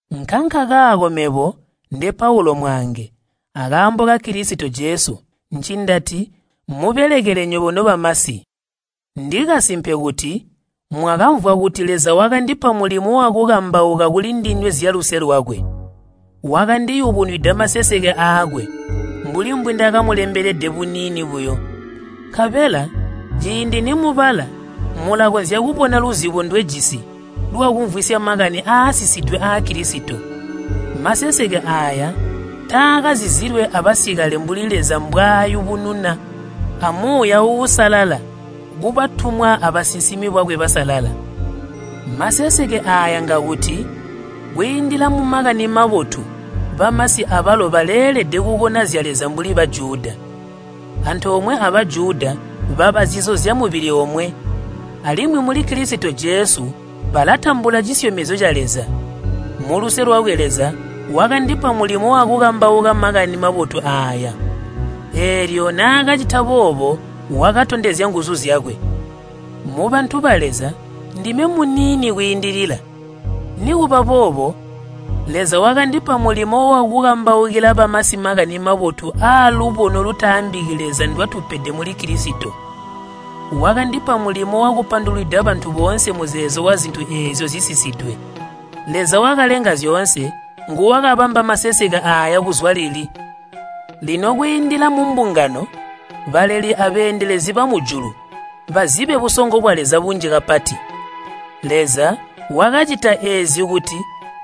Nkankakaako mebo, nde Paulu mwaange akaambo ka Kilisito Jesu ncindati mmubelekele nywebo nobamasi, ndikasimpe kuti mwakamvwa kuti Leza wakandipa mulimo wakukambauka kulindinywe zyaluse lwakwe. Wakandiyubunwida maseseke aakwe, mbuli mbwindakamulembelede buniini buyo. Nkabela ciindi nimubala mulakonzya kubona luzibo ndwejisi lwakumvwisya makani aasisidwe aa Kilisito. Maseseke aaya taakazizilwe abasikale mbuli Leza mbwaayubununa a Muuya Uusalala kubatumwa abasinsimi bakwe basalala. Maseseke aaya ngakuti kwiindila mu Makani Mabotu bamasi abalo baleelede kukona zya Leza mbuli Bajuda. Antoomwe a Bajuda baba zizo zyamubili omwe, alimwi muli Kilisito Jesu balatambula cisyomezyo ca Leza. Muluse lwakwe Leza wakandipa mulimo wakukambauka Makani Mabotu aaya. Eelyo naakacita boobo wakatondezya nguzu zyakwe. Mubantu ba Leza ndime muniini kwiindilila, nikuba boobo Leza wakandipa mulimo wakukambaukila bamasi Makani Mabotu aalubono lutaambiki Leza ndwatupede muli Kilisito. Wakandipa mulimo wakupandulwida bantu boonse muzeezo wazintu eezyo zisisidwe. Leza wakalenga zyoonse nguwakabamba maseseke aaya kuzwa lili. Lino kwiindila mumbungano baleli abeendelezi bamujulu bazibe busongo bwa Leza bunji kapati. Leza wakacita eezi kuti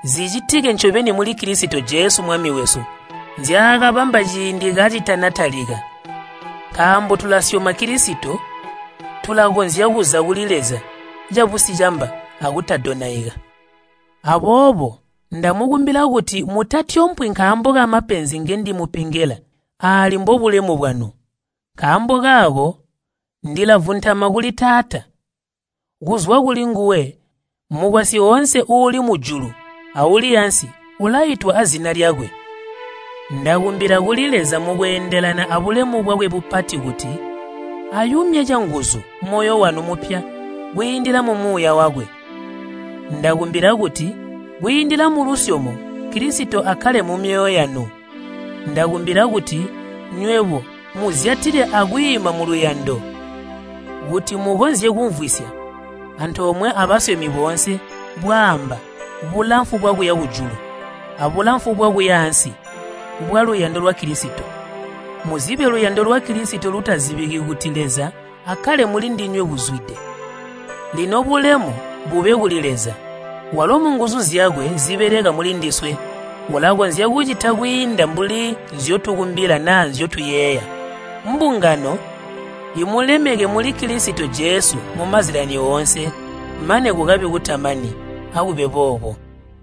zicitike ncobeni muli Kilisito Jesu Mwami wesu nzyaakabamba ciindi kacitanatalika. Nkaambo tulasyoma Kilisito, tulakonzya kuza kuli Leza cabusicamba akutadonaika. Aboobo ndamukumbila kuti mutatyompwi nkaambo kamapenzi ngendimupengela, aali mbobulemu bwanu. Nkaambo kaako ndilavuntama kuli Taata, kuzwa kulinguwe mukwasyi oonse uuli mujulu auli aansi ulaitwa azina lyakwe. Ndakumbila kuli Leza mukweendelana abulemu bwakwe bupati kuti ayumye canguzu moyo wanu mupya kwiindila mu Muuya wakwe. Ndakumbila kuti kwiindila mulusyomo Kilisito akkale mumyoyo yanu. Ndakumbila kuti nywebo muzyatile akwiima muluyando, kuti mukonzye kumvwisya antoomwe abasyomi boonse bwaamba, bulamfu bwakuya mujulu, abulamfu bwakuya ansi, bwaluyando lwa Kilisito. Muzibe luyando lwa Kilisito lutazibiki kuti Leza akkale mulindinywe buzwide. Lino bulemu bube kuli Leza, walo munguzu zyakwe zibeleka mulindiswe, ulakonzya kucita kwiinda mbuli nzyotukumbila naa nzyotuyeeya. Mbungano imulemeke muli Kilisito Jesu mumazyalani oonse, mane kukabe kutamani. Akube boobo.